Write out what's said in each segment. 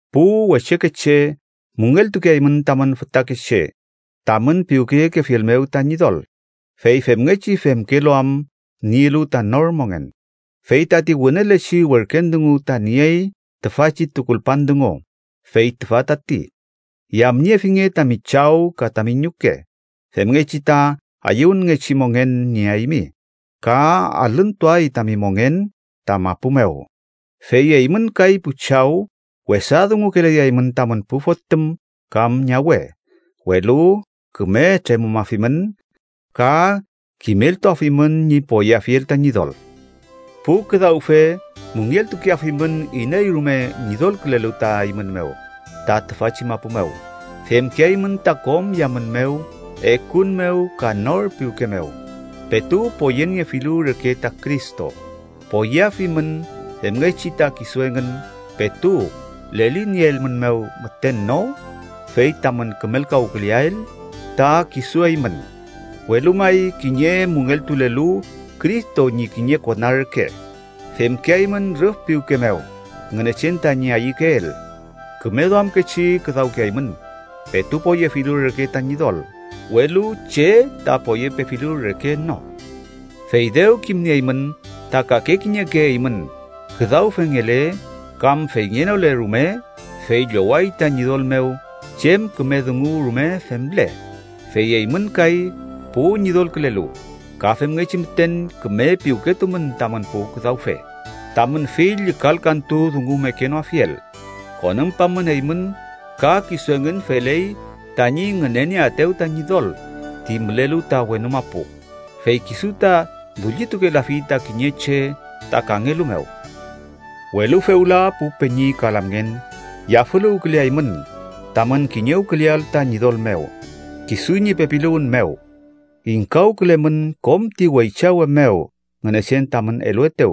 Pu wechekeche, müngeltukeaymün tamün fütakeche tamün piwkeyekefiel mew ta Ñidol, fey femngechi femkelu am nielu ta nor mongen. Fey tati wünelechi werken dungu ta niey tüfachi tukulpan dungu, fey tüfa tati: “Yamniefinge tami chaw ka tami ñuke, femngechi ta ayüwünngechi mongen nieaymi, ka alüntuay tami mongen ta mapu mew.” Fey eymün kay pu chaw, wesa dungukelayaymün tamün pu fotüm kam ñawe, welu küme tremümafimün ka kimeltuafimün ñi poyeafiel ta Ñidol. Pu küdawfe müngeltukeafimün iney rume ñidolkülelu ta eymün mew ta tüfachi mapu mew. Femkeaymün ta kom yamün mew, ekun mew ka nor piwke mew, petu poyeniefilu reke ta Cristo. Poyeafimün, femngechi ta kisu engün petu lelinieelmünmew müten no, fey tamün kümelkawküleael ta kisu eymün, welu may kiñe müngeltulelu Cristo ñi kiñe kona reke, femkeaymün rüf piwke mew Ngünechen tañi ayükeel. Küme duamkechi küdawkeaymün, petu poyefilu reke ta Ñidol, welu che ta poyepefilu reke no. Fey dew kimnieymün ta kake kiñeke eymün, küdawfengele kam feyngenole rume, fey lloway ta Ñidol mew chem küme dungu rume femle. Fey eymün kay, pu ñidolkülelu, ka femngechi müten küme piwketumün tamün pu küdawfe, tamün fill llükalkantu dungu mekenoafiel. Konümpamün, eymün ka kisu engün feley tañi ngünenieaetew ta Ñidol ti mülelu ta wenu mapu, fey kisu ta dullitukelafi ta kiñe che ta kangelu mew. Welu fewla, pu peñi ka lamngen, yafüluwküleaymün tamün kiñewküleael ta Ñidol mew, kisu ñi pepiluwün mew. Ingkawkülemün kom ti weychawe mew Ngünechen tamün eluetew,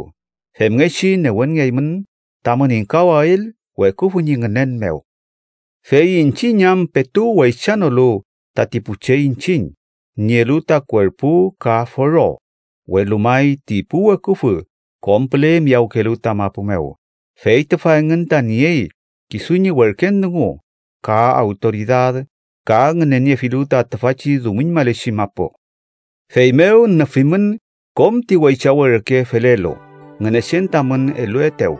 femngechi newenngeaymün tamün ingkawael weküfü ñi ngünen mew. Fey iñchiñ am petu weychanolu tati pu che iñchiñ nielu ta kuerpu ka foro, welu may ti pu weküfü kom püle miyawkelu ta mapu mew, fey tüfa engün ta niey kisu ñi werken dungu, ka awtoridad ka ngüneniefilu ta tüfachi dumiñmalechi mapu. Feymew, nüfimün kom ti weychawe reke felelu Ngünechen tamün eluetew,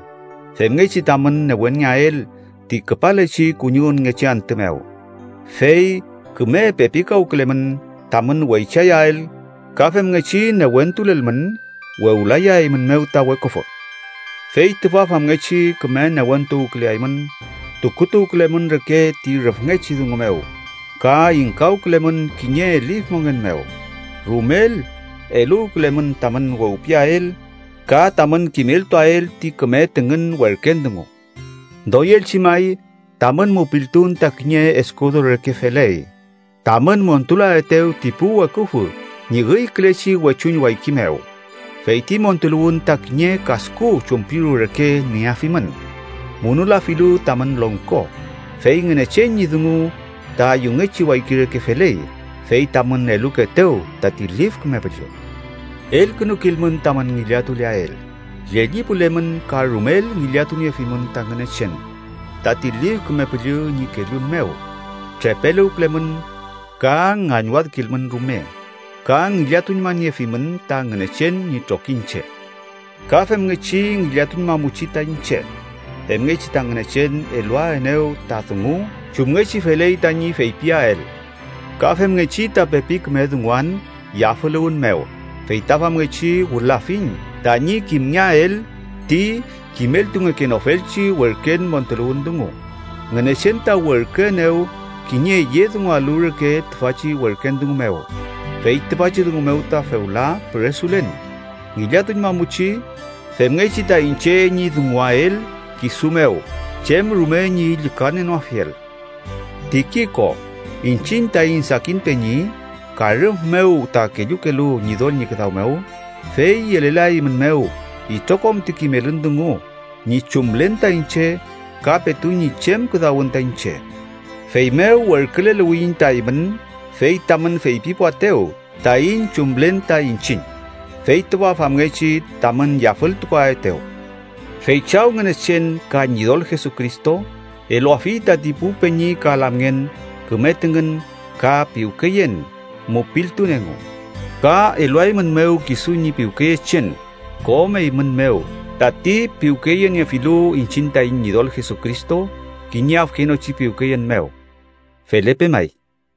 femngechi tamün newenngeael ti küpalechi kuñiwünngechi antü mew. Fey küme pepikawkülelmün tamün wechayael ka femngechi newentulelmün, wewlayaeymünmew ta weküfü. Fey tüfa famngechi küme newentuwküleaymün, tukutuwkülemün reke ti rüfngechi dungu mew ka ingkawkülemün kiñe lif mongen mew. Rumel eluwkülemün tamün wewpiael ka tamün kimeltuael ti küme tüngün werken dungu. Doyelchi may, tamün mupiltun ta kiñe eskudo reke feley tamün montulaetew ti pu weküfü ñi üykülechi wechuñ wayki mew. Fey ti montuluwün ta kiñe kasku chumpiru reke nieafimün, munulafilu tamün longko. Fey Ngünechen ñi dungu ta yungechi wayki reke feley, fey tamün elukeetew tati Lif Küme Püllü. Elkünukilmün tamün ngillatuleael. Llellipulemün ka rumel ngillatuniefimün ta Ngünechen, tati Lif Küme Püllü ñi kellun mew. Trepeluwkülemün, ka ngañwadkilmün rume. Ka ngillatuñmaniefimün ta Ngünechen ñi trokiñche. Ka femngechi ngillatuñmamuchi ta iñche, femngechi ta Ngünechen eluaenew ta dungu chumngechi feley tañi feypiael. Ka femngechi ta pepi küme dunguan yafüluwün mew fey ta famngechi wülafiñ tañi kimngeael ti kimeltungekenofelchi werken montuluwün dungu. Ngünechen ta werküenew kiñe yedungualu reke tüfachi werken dungu mew, fey tüfachi dungu mew ta fewla püresulen. Ngillatuñmamuchi femngechi ta iñche ñi dunguael kisu mew chem rume ñi llükanienoafiel. Tikiko, iñchiñ taiñ sakin peñi, ka rüf mew ta kellukelu Ñidol ñi küdaw mew, fey yelelaeymünmew itrokom ti kimelün dungu ñi chumlen ta iñche ka petu ñi chem küdawün ta iñche. Feymew werküleluwiyiñ ta eymün, fey tamün feypipuaetew taiñ chumlen ta iñchiñ, fey tüfa famngechi tamün yafültukuaetew. Fey Chaw Ngünechen, ka Ñidol Jesucristo, eluafi tati pu peñi ka lamngen küme tüngün ka piwkeyen, mupiltun engu. Ka eluaeymünmew kisu ñi piwkeyechen kom eymün mew tati piwkeyeniefilu iñchiñ taiñ Ñidol Jesucristo kiñe afkenochi piwkeyen mew. Felepe may.